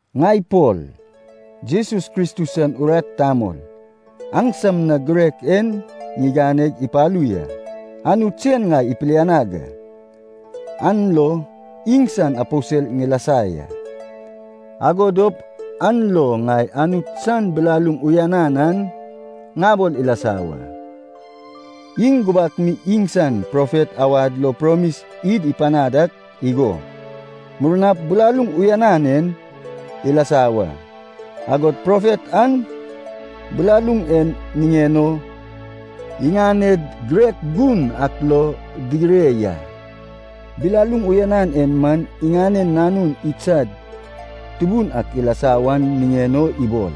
Ŋai Pol, Jesus Kristus san urat tamol, aŋsam na girek en ŋiganeg ipalu ya. Anut sen ŋai ipilianag a, an lo iŋsan aposel ŋilasa ya. Ago dop an lo ŋai Anut san bilaluŋ uyanan an ŋabol ilasa wa. Iŋ gubak mi iŋsan profet awad lo promis id ipanad ak igo, murnap bilaluŋ uyanan en ilasa wa, agod profet an bilaluŋ en niŋen o iŋaned girek gun ak lo digire ya. Bilaluŋ uyanan en man iŋanen Nanun idsad Tubun ak ilasa wan niŋen o ibol.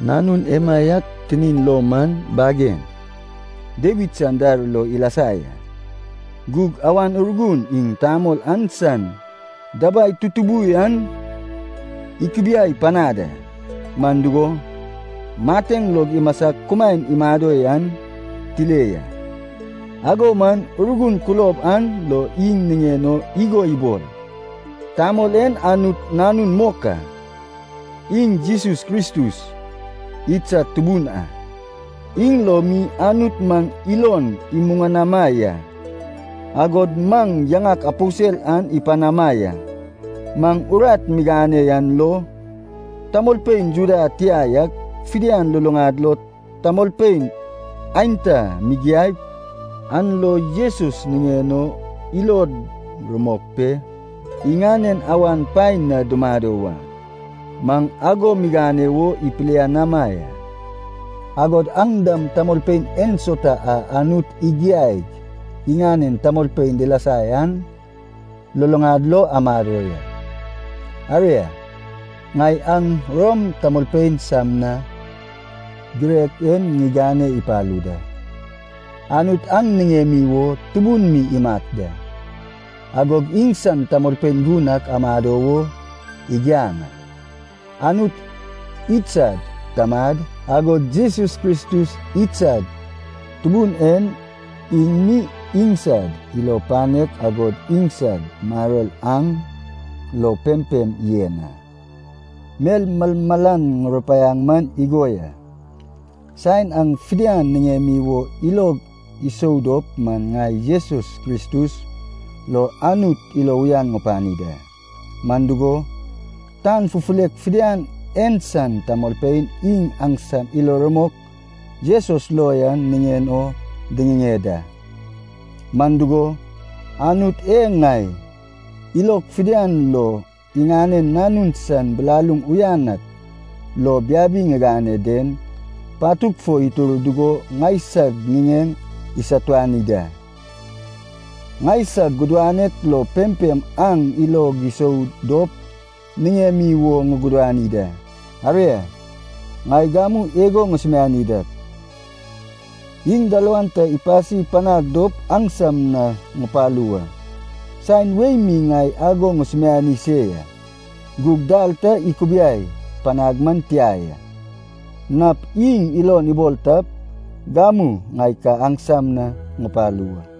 Nanun emaiak tinin lo man bagen Dawid san dar lo ilasa ya. Gug Awan Urgun iŋ tamol an san dabai tutubu yan ikubiai panad a, man dugo, mateŋ lo imasag kumaen imado yan tile ya. Ago man Urgun kulob an lo iŋ niŋen o igo ibol, tamol en Anut Nanun mok a. Iŋ Jesus Kristus, idsad Tubun a. Iŋ lo mi Anut maŋ ilon imuŋanama ya, agod maŋ yaŋak aposel an ipanama ya. Maŋ urat migane yan lo, tamolpein Juda tia yak fidian luluŋad lo tamolpein aenta migiaip, an lo Jesus niŋen o ilod rumok pe iŋanen awan paen na dumado wa. Maŋ ago migane wo ipilianama ya. Agod aŋ dam tamolpein ensauta a Anut igiaig iŋanen tamolpein dilasa yan luluŋad lo amado ya. Aria, ŋai aŋ Rom tamolpein sam na girek en ŋigane ipalu da. Anut aŋ niŋemi wo tubun mi imat da, agog iŋsan tamolpein gun ak amado wo igiaŋ a. Anut idsad Tamad, agod Jesus Kristus idsad Tubun en, iŋ mi iŋsad ilo panek agod iŋsad maror aŋ lo pempem yen a. Mel malmalan ŋurupaiaŋ man igo ya. Saen aŋ fidian niŋemi wo ilog isou dop man ŋai Jesus Kristus lo Anut ilo uyan ŋupani da. Man dugo, tan fufulek fidian en san tamolpein iŋ aŋsam ilo rumok Jesus lo yan niŋen o diŋiŋeŋ da. Man dugo, Anut e ŋai ilog fidian lo iŋanen Nanun san bilaluŋ uyan ak lo biabi ŋigane den, patug fo itur dugo ŋaisag ŋiŋeŋ isatuani da, ŋaisag gudanek lo pempem aŋ ilog isou dop niŋemi wo ŋugudani da. Aria, ŋai gamu igo ŋusumiani dak, iŋ dalawan ta ipasi panag dop aŋsam na ŋupalu wa. Saen wei mi ŋai ago ŋusumiani se ya, gug dal ta ikubiai panag man tia ya. Nap iŋ ilon ibol tap, gamu ŋai ka aŋsam na ŋupalu wa.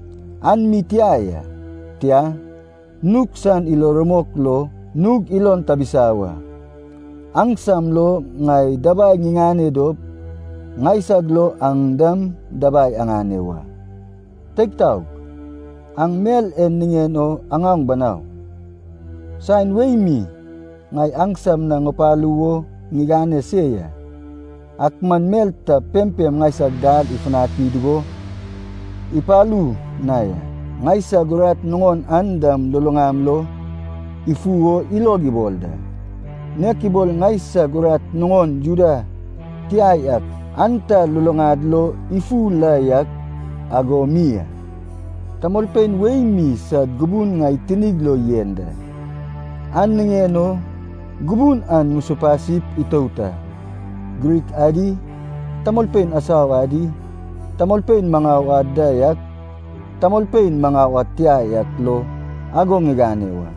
An mi tia ya, tia, nug san ilo rumok lo nug ilon tabisa wa. Aŋsam lo ŋai dabai ŋiŋane dop, ŋaisag lo aŋ dam dabai aŋane wa. Teig taog, aŋ mel en niŋen o aŋaoŋ banau. Saen wei mi ŋai aŋsam na ŋupalu wo ŋigane se ya, ak man mel ta pempem ŋaisag dal ifutani dugo ipalu na ya. Ŋaisag urat nuŋon an dam luluŋam lo ifu o ilog ibol da, nek ibol ŋaisag urat nuŋon Juda tia yak aenta luluŋad lo ifu la yak ago mi a. Tamolpein wei mi sad gubun ŋai tinig lo yen da, an niŋen o gubun an ŋusupasip itout a. Grik adi, tamolpein asau adi, tamolpein maŋau ad da yak, tamolpein maŋau ad tia yak lo ago ŋigane wa.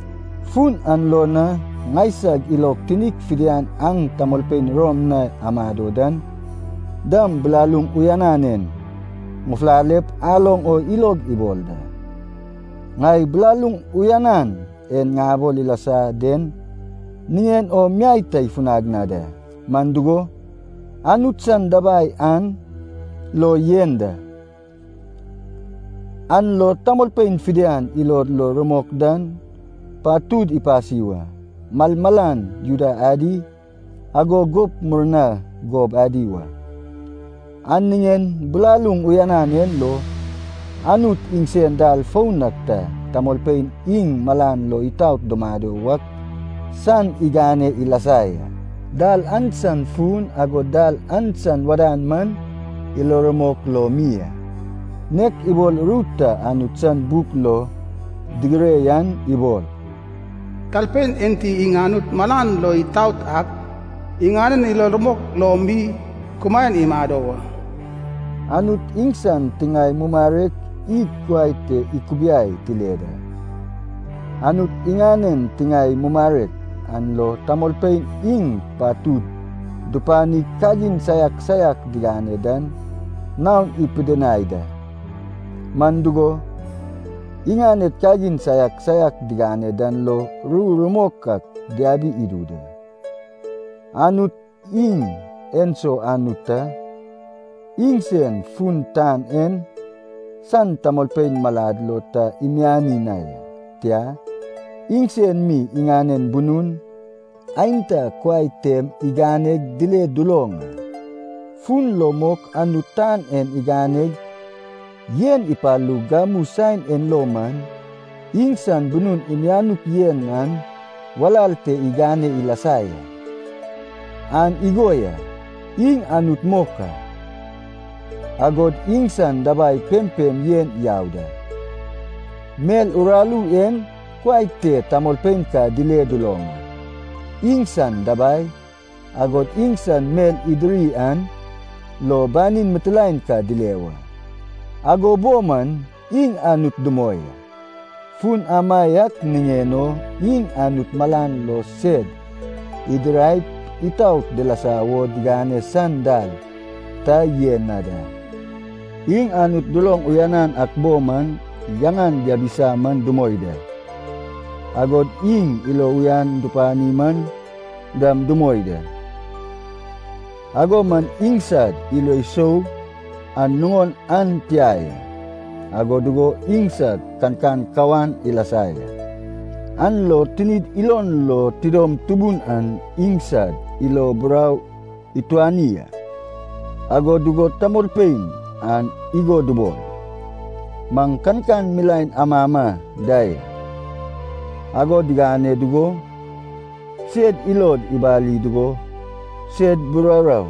Fun an lo na ŋaisag ilog tinig fidian aŋ tamolpein Rom na amado dan dam bilaluŋ uyanan en ŋufulalep aloŋ o ilog ibol da. Ŋai bilaluŋ uyanan e ŋabol ilasa den niŋen o miai ta ifunag na da. Man dugo, Anut san dabai an lo yen da, an lo tamolpein fidian ilod lo rumok dan patud ipasi wa. Malmalan Juda adi, ago gup murna gob adi wa. An niŋen bilaluŋ uyanan en lo, Anut iŋsen dal foun ak ta tamolpein iŋ malan lo itaot dumado wak san igane ilasa ya. Dal an san fun, agod dal an san wadan man ilo rumok lo mi a. Nek ibol ru ta Anut san buk lo digire yan ibol, “Talpein enti iŋ Anut malan lo itaot ak, iŋanen ilo rumok lo mi kumaen imado wa.” Anut iŋsan tiŋae mumarek id kuai te ikubiai tile da. Anut iŋanen tiŋae mumarek an lo tamolpein iŋ patud dupanig kagin saiak saiak digane dan naon ipidinai da. Man dugo, iŋaned kagin saiak saiak digane dan lo ru rumok ak diabi idu da. Anut iŋ enso Anut ta, iŋsen fun tan en san tamolpein malad lo ta imiani na ya, tia, iŋsen mi iŋanen bunun aenta kuai tem iganeg dile duloŋ a. Fun lo mok Anut tan en iganeg yen ipalug gamu saen en lo man, iŋsan bunun imianuk yen an walal te igane ilasa ya. An igo ya, iŋ Anut mok a, agod iŋsan dabai pempem yen yau da. Mel uraru en kuai te tamolpein ka dile duloŋ a, iŋsan dabai, agod iŋsan mel idiri an lo banin mitilaen ka dile wa. Ago bo man iŋ Anut dumoi a. Fun amaiak niŋen o iŋ Anut malan lo sed idiraip itaot dilasa wo digane san dal ta yen na da. Iŋ Anut duloŋ uyanan ak bo man yaŋan diabisa man dumoi da, agod iŋ ilo uyan dupani man dam dumoi da. Ago man iŋsad ilo sou an nuŋon an tia ya, ago dugo iŋsad kankan kawan ilasa ya, an lo tinid ilon lo tidom tubun an iŋsad ilo burau ituani a. Ago dugo tamolpein an igo dubol, “Maŋ kankan milaen amama da ya.” Ago digane dugo, sed ilod ibali dugo sed buraurau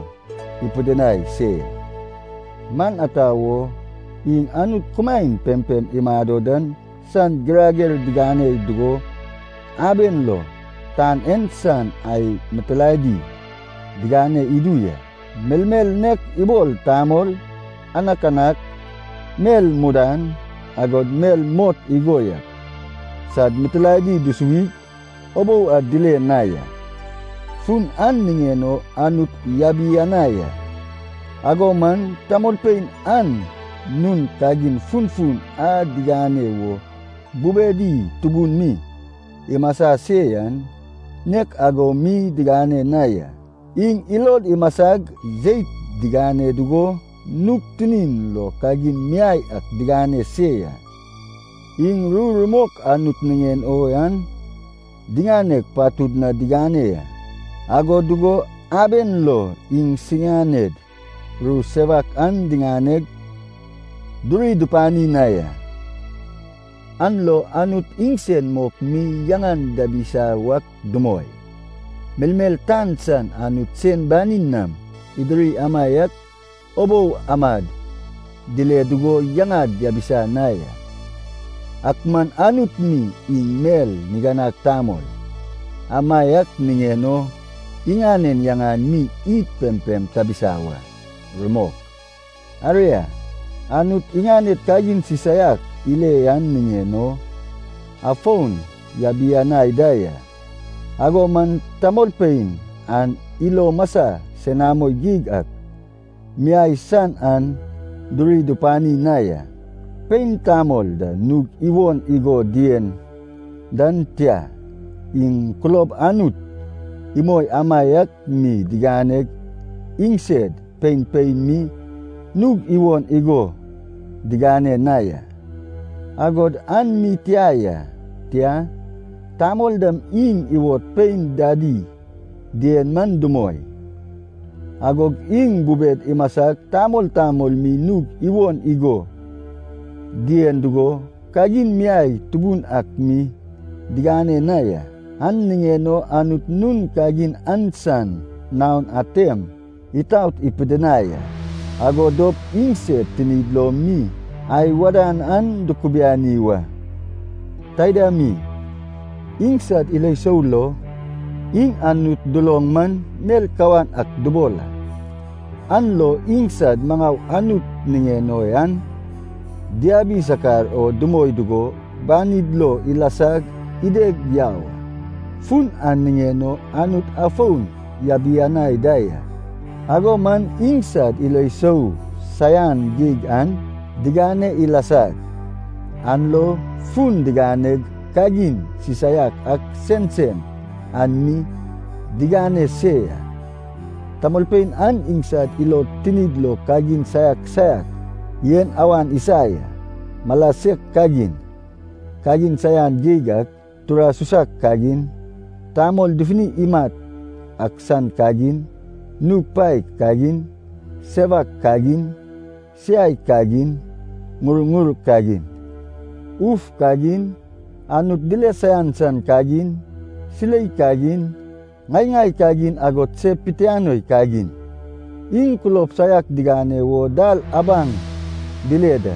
ipidinai se ya. Man ata wo? Iŋ Anut kumaen pempem imado dan san girager diŋane dugo, aben lo tan en san ai mitilaedi digane idu ya. Melmel nek ibol tamol, anakanak, mel mudan, agod mel mot igo yak, sad mitilaedi dusuwig ubou ad dile na ya. Fun an niŋen o Anut yabianai a. Ago man tamolpein an nun kagin funfun a digane wo bubedi tubun mi imasa se yan, nek ago mi digane na ya. Iŋ ilod imasag jeit digane dugo nug tinin lo kagin miai ak digane se ya. Iŋ ru rumok Anut niŋen o yan diŋaneg patud na digane ya, ago dugo aben lo iŋsiganed ru sewak an diganeg duri dupani na ya. An lo Anut iŋsen mok mi yaŋan diabisa wak dumoi, melmel tan san Anut sen banin nam idiri amaiak ubou amad dile dugo yaŋad diabisa na ya. Ak man Anut mi iŋ mel niganag tamol, amaiak niŋen o iŋanen yaŋan mi id pempem tabisa wa. Rumok. Aria, Anut iŋaned kagin sisaiak ile yan niŋen o, afon yabianai da ya. Ago man tamolpein an ilo masai senamo geig ak miai san an duri dupani na ya. Pein tamol da nug iwon igo dien dan tia, iŋ kulob Anut imoi amaiak mi diganeg iŋsed pein pein mi nug iwon igo digane na ya. Agod an mi tia ya. Tia, tamol dam iŋ iwod pein dadi dien man dumoi, agog iŋ bubed imasag tamol tamol mi nug iwon igo dien dugo, kagin miai tubun ak mi digane na ya. An niŋen o Anut nun kagin an san naon atem itaot ipidinai a, ago dop iŋsed tinid lo mi ai wadan an dukubiani wa. Taida mi, iŋsad ilo sou lo, iŋ Anut duloŋ man mel kawan ak dubol a, an lo iŋsad maŋau Anut niŋen o yan diabi sakar o dumoi dugo, banid lo ilasag ideg yau a. Fun an niŋen o Anut afon yabianai da ya. Ago man iŋsad ilo sou saian geig an digane ilasag, an lo fun diganeg kagin sisaiak ak sensen an mi digane se ya. Tamolpein an iŋsad ilod tinid lo kagin saiak saiak en awan isa ya. Mala sek kagin, kagin saian geig ak, tura susak kagin, tamol dufuni imat ak san kagin, nug paek kagin, sewak kagin, siai kagin, ŋurŋur kagin, uf kagin, Anut dile saian san kagin, silei kagin, ŋai-ŋai kagin agod se pitianoi kagin. Iŋ kulob saiak digane wo dal abaŋ dile da,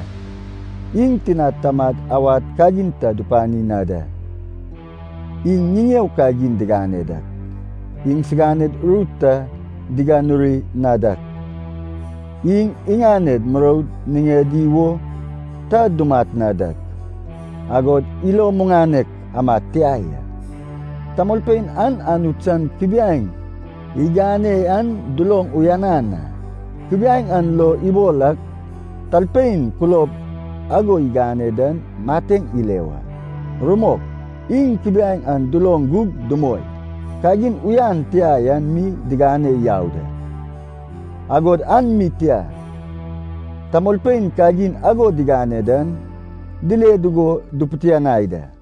iŋ tinad tamad awad kagin ta dupani na da. Iŋ ŋiŋeo kagin digane dak, iŋsiganed ru ta diganuri na dak, iŋ iŋaned muroud niŋedi wo ta dumat na dak, agod ilo muŋanek amad tia ya. Tamolpein an Anut san kubiaeŋ igane yan duloŋ uyanan a, kubiaeŋ an lo ibol ak talpein kulob ago igane dan mateŋ ile wa. Rumok, iŋ kubiaeŋ an duloŋ gug dumoi, kagin uyan tia yan mi digane yau da. Agod an mi tia, tamolpein kagin ago digane dan dile dugo dupitianai da.